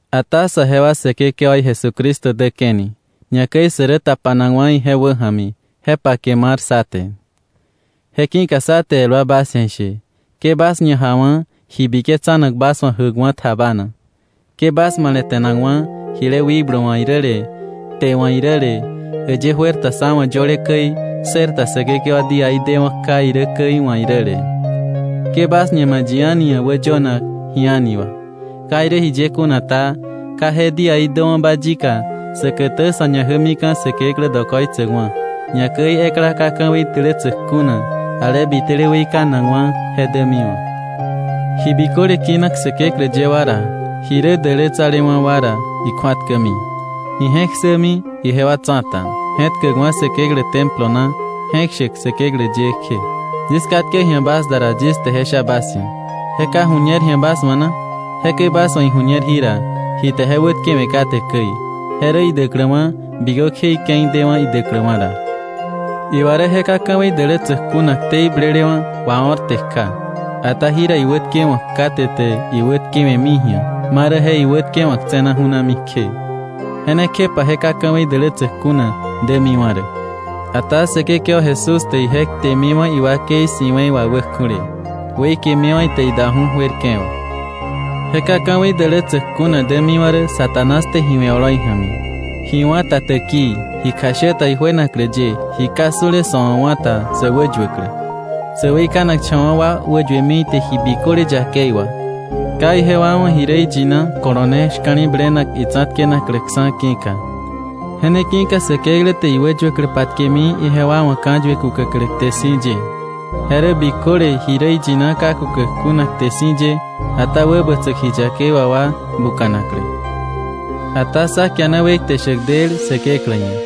Ata saje wa Säkekewaí Jesucristo däke̱ni, ñakäi sä rä tapanakwa̱ ije wäja̱mi, je pake mar sá te. Je ki̱ka sá te el wa bas ia̱ ishe: ke bas ñajawa̱ ji biketsanak bas wa̱ jäkwa̱ tjabana, ke bas male̱te̱nakwa̱ jile wikblu wa̱ iräle, kte wa̱ iräle, äyë juer ta sá wa̱ yöle käi ssërta Säkekewa díaí dewa̱ kja irä käi wa̱ iräle. Ke bas ñama̱ yi a̱ni ia̱ wäyönak ji a̱ni wà. Ka irä jiye kuna ta, ka je díaí däwa̱ba yika säkätä sa̱ ñajämika̱ Säkeklä dokoitsäkwa̱, ñakäi ekla ka ka̱wei dälätsäk kuna, ale bitele weikanakwa̱, je dämiwa̱. Ji biköle kinak Säkeklä ye wa ra, ji rä dälätsalewa̱ wa ra ikju̱atkämi, ije̱k ssämi ijewa tsa̱ta, je̱tkäkwa̱ Säkeklä Templo na je̱k shäk Säkeklä ye kje. Yis katke ji̱a bas da ra, yis te je sha bas ia̱, ¿je ka ju̱ñer ji̱a bas wa̱ na? Jekäi bas wa̱ iju̱ñer jira ji te je wätkewe̱ kate käi, je rä idäkläwa̱ bikökje ike̱i dewa̱ idäkläwa̱ ra. Iwa rä je ka ka̱wei dälätsäk kuna ktei blelewa̱ wao̱rte kja. Ata jira iwätkewa̱k kate te iwätkewe̱mi ji̱a, ma rä je iwätkewa̱k tse̱na ju̱nami kje. Je ne kjepa je ka ka̱wei dälätsäk kuna dämiwa̱ rä. Ata Säkekewa Jesús te ije ktemiwa̱ iwakei si̱we̱i wà wäkju̱le, weikemiwa̱ ite idaju̱ juerke̱ wà. Je ka ka̱wei dälätsäk kuna dämiwa̱ rä Satanás te ji we̱ oloi ja̱mi, ji wá̱ ta täkii, ji kjashä ta ijuenaklä ye, ji ka su̱le sa̱ wa̱ wá̱ ta sä wäyuäklä, sä weikanakcha̱wa̱ wa wäyuemi ite ji biköle yakei wà, ka ijewa wa̱ ji rä iyina kolone shka̱li̱blenak itsa̱tkenakläksa̱ ki̱ka. Je ne ki̱ka Säkeklä te iwäyuäklä patkemi ijewa wa̱ ka̱yue kukäklä kte si̱ ye, je rä biköle ji rä iyina ka kukäk kuna kte si̱ ye, ata wäbätsäk ji yakei wà wa buka̱naklä. Ata sá kiana wekte shäk del Säkeklä ia̱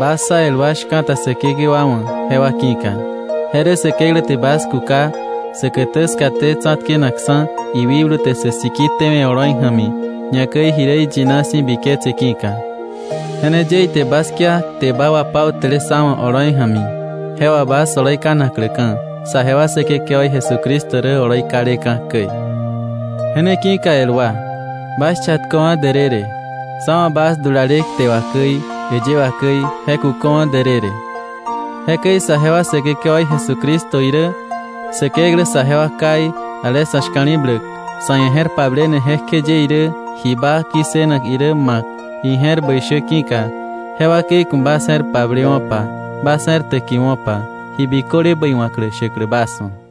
bas sá el wa shka̱ta Säkekewa wa̱ jewa ki̱ka, je rä Säkeklä te bas kuka säkätä skaté tsa̱tkenakksa̱ iwikblu te sä siki tewe̱ oloi ja̱mi, ñakäi ji rä iyina si̱ biketse ki̱ka. Je ne ye ite bas kia kte baa wapautäle sá wa̱ oloi ja̱mi, je wà bas oloi ka̱nakläka̱ saje wa Säkekewaí Jesucristo rä oloi kaleka̱ käi. Je ne ki̱ka el wa, bas chatköwa̱ därërë, sá wa̱ bas dulale kte wà käi äyë wà käi je kuköwa̱ därërë. Jekäi saje wa Säkekewaí Jesucristo irä Säkeklä saje wa Káí ale sa̱ shka̱li̱bläk, sa̱ ia̱ je̱r pablene jekjeye irä ji baa ki̱ssënak irä ma̱k ije̱r bäi shä ki̱ka, je wakei ku̱ bas je̱r pablewo̱pa, bas je̱r täkiwo̱pa, ji biköle bäi wa̱klä shäklä bas wa̱.